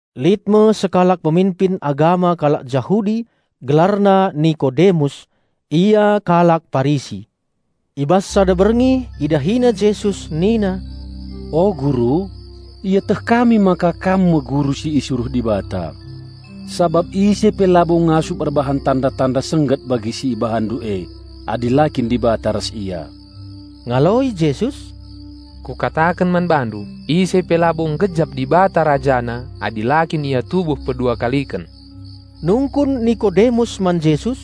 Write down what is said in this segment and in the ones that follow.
Lit me sekalak peminpin agama kalak Jahudi, gelarna Nikodemus; ia kalak Parisi. I bas sada berngi idahina Jesus nina, "O Guru, ieteh kami maka Kam me Guru si isuruh Dibata. Sabap ise pe labo ngasup erbahan tanda-tanda sengget bagi si IbahanNdu e, adi la kin Dibata ras ia." Ngaloi Jesus, "Kukataken man bandu: Ise pe labo nggejap Dibata Rajana adi la kin ia tubuh pedua kaliken." Nungkun Nikodemus man Jesus,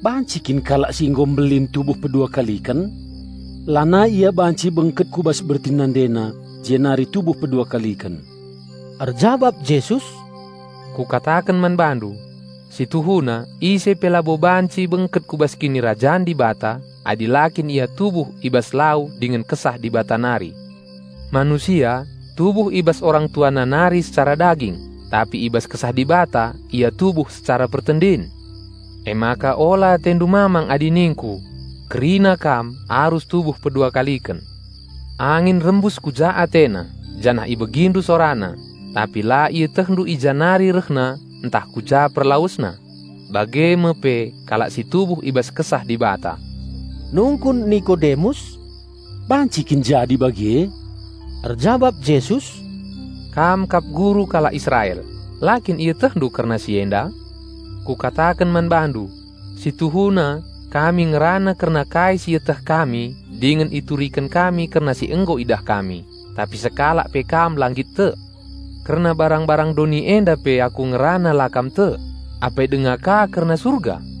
"Banci kin kalak si nggo mbelin tubuh pedua kaliken? Lanai ia banci bengket ku bas bertin nandena jenari tubuh pedua kaliken!" Erjabap Jesus, "Kukataken man bandu: Si tuhuna ise pe labo banci bengket ku bas Kinirajan Dibata adi la kin ia tubuh i bas lau dingen Kesah Dibata nari. Manusia tubuh i bas orang tuana nari secara daging, tapi i bas Kesah Dibata ia tubuh secara pertendin. Emaka ola atendu mamang adi ningku, 'Kerina kam arus tubuh pedua kaliken.' Angin rembus ku ja atena, janah ibegindu sorana, tapi la ietehndu i ja nari rehna ntah ku ja perlawesna. Bage me pe kalak si tubuh i bas Kesah Dibata." Nungkun Nikodemus, "Banci kin jadi bage?" Erjabap Jesus, "Kam kap guru kalak Israel, la kin ietehndu kerna si enda? Kukataken man bandu: Si tuhuna kami ngerana kerna kai si ieteh kami dingen ituriken kami kerna si nggo idah kami, tapi sekalak pe kam la nggit tek. Kerna barang-barang doni enda pe aku ngerana la kam tek, apai denga ka kerna Surga?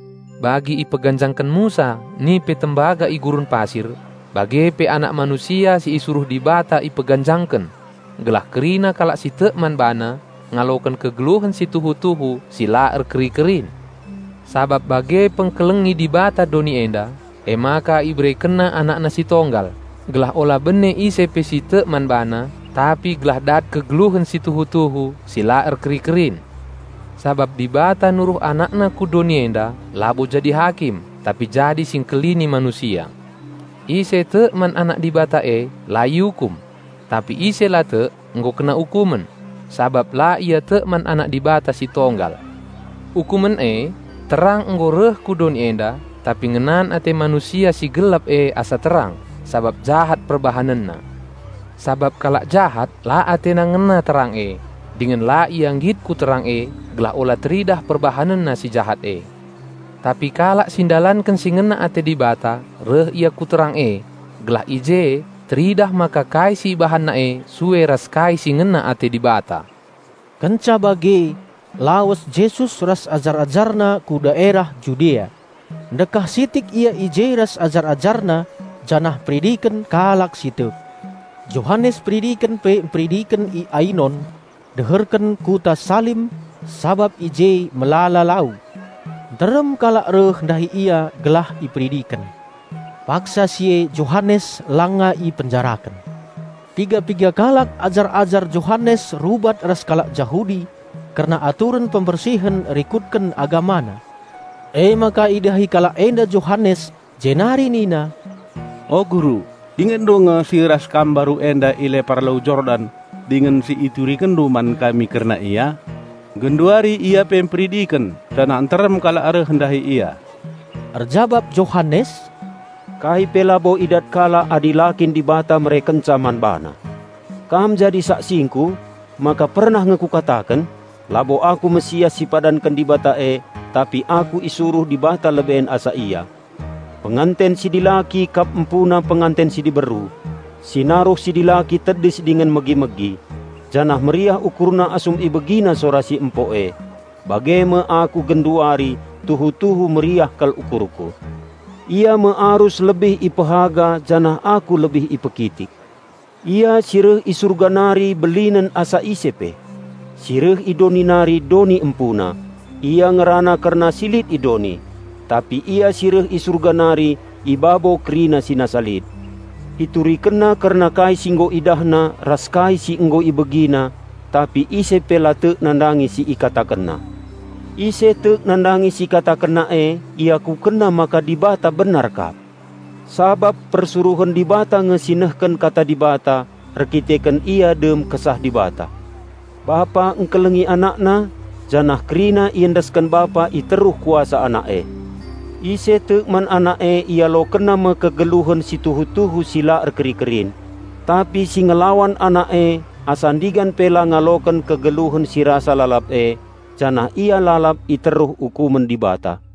Bagi ipeganjangken Musa nipe tembaga i gurun pasir, bage pe Anak Manusia si isuruh Dibata ipeganjangken, gelah kerina kalak si tek man BaNa ngaloken kegeluhen si tuhu-tuhu si la erkeri-kerin. Sabab bage pengkelengi Dibata doni enda, emaka IberekenNa AnakNa Sitonggal, gelah ola bene isie pe si tek man Bana, tapi gelah dat kegeluhen si tuhu-tuhu si la erkeri-kerin. Sabap Dibata nuruh AnakNa ku doni enda labo jadi Hakim tapi jadi Singkelini manusia. Ise tek man Anak Dibata e la iukum; tapi ise la tek, nggo kena ukumen, sabap la ia tek man Anak Dibata si Tonggal. Ukumen e: Terang nggo reh ku doni enda, tapi ngenan ate manusia si gelap e asa terang, sabap jahat perbahanenna. Sabap kalak jahat la atena ngena terang e, dingen la ia nggit ku terang e gelah ola teridah perbahanenna si jahat e. Tapi kalak si ndalanken si ngena ate Dibata reh ia ku terang e, gelah i je teridah maka kai si ibahanna e sue ras kai si ngena ate Dibata." Kenca bage lawes Jesus ras ajar-AjarNa ku daerah Judea; ndekah sitik Ia i je ras ajar-AjarNa janah mperidiken kalak si tek. Johanes Peridiken pe mperidiken i Ainon, deherken kuta Salim, sabap i je melala lau. Nterem kalak reh ndahi ia gelah iperidiken. (Paksa si e Johanes langa ipenjaraken.) Piga-piga kalak ajar-ajar Johanes rubat ras kalak Jahudi kerna aturen pembersihen rikutken agamana. Emaka idahi kalak enda Johanes jenari nina, "O Guru, ingetndu nge si ras kam mbaru enda i lepar Lau Jordan dingen si iturikenndu man kami kerna Ia? Genduari Ia pe mperidiken janah nterem kalak reh ndahi Ia." Erjabap Johanes, "Kai pe labo idat kalak adi la kin Dibata merekenca man bana. Kam jadi saksingku maka pernah nge kukataken, 'Labo aku Raja Penampat si ipadanken Dibata e, tapi aku isuruh Dibata leben asa Ia.' Penganten si dilaki kap empuna penganten si diberu. Si naruh si dilaki tedis dingen megi-megi; janah meriah ukurna asum ibegina sora si empo e. Bage me aku genduari; tuhu-tuhu meriah kal ukurku. Ia me arus lebih ipehaga janah aku lebih ipekitik." Ia si reh i Surga nari belinen asa ise pe. Si reh i doni nari, doni empuna. Ia ngerana kerna si lit i doni. Tapi Ia, si reh i Surga nari i babo kerina si nasa lit. IturikenNa kerna kai si nggo IdahNa ras kai si nggo IbegiNa tapi ise pe la tek nandangi si IkatakenNa. Ise tek nandangi si IkatakenNa e, iakukenna maka Dibata benar kap. Sabap persuruhen Dibata nge si nehken kata Dibata, erkiteken ia dem Kesah Dibata. Bapa ngkelengi AnakNa, janah kerina iendesken Bapa i teruh kuasa Anak e. Ise tek man Anak e ialokenna me kegeluhen si tuhu-tuhu si la erkeri-kerin. Tapi si ngelawan Anak e asa ndigan pe la ngaloken kegeluhen si rasa lalap e, janah ia lalap i teruh ukumen Dibata.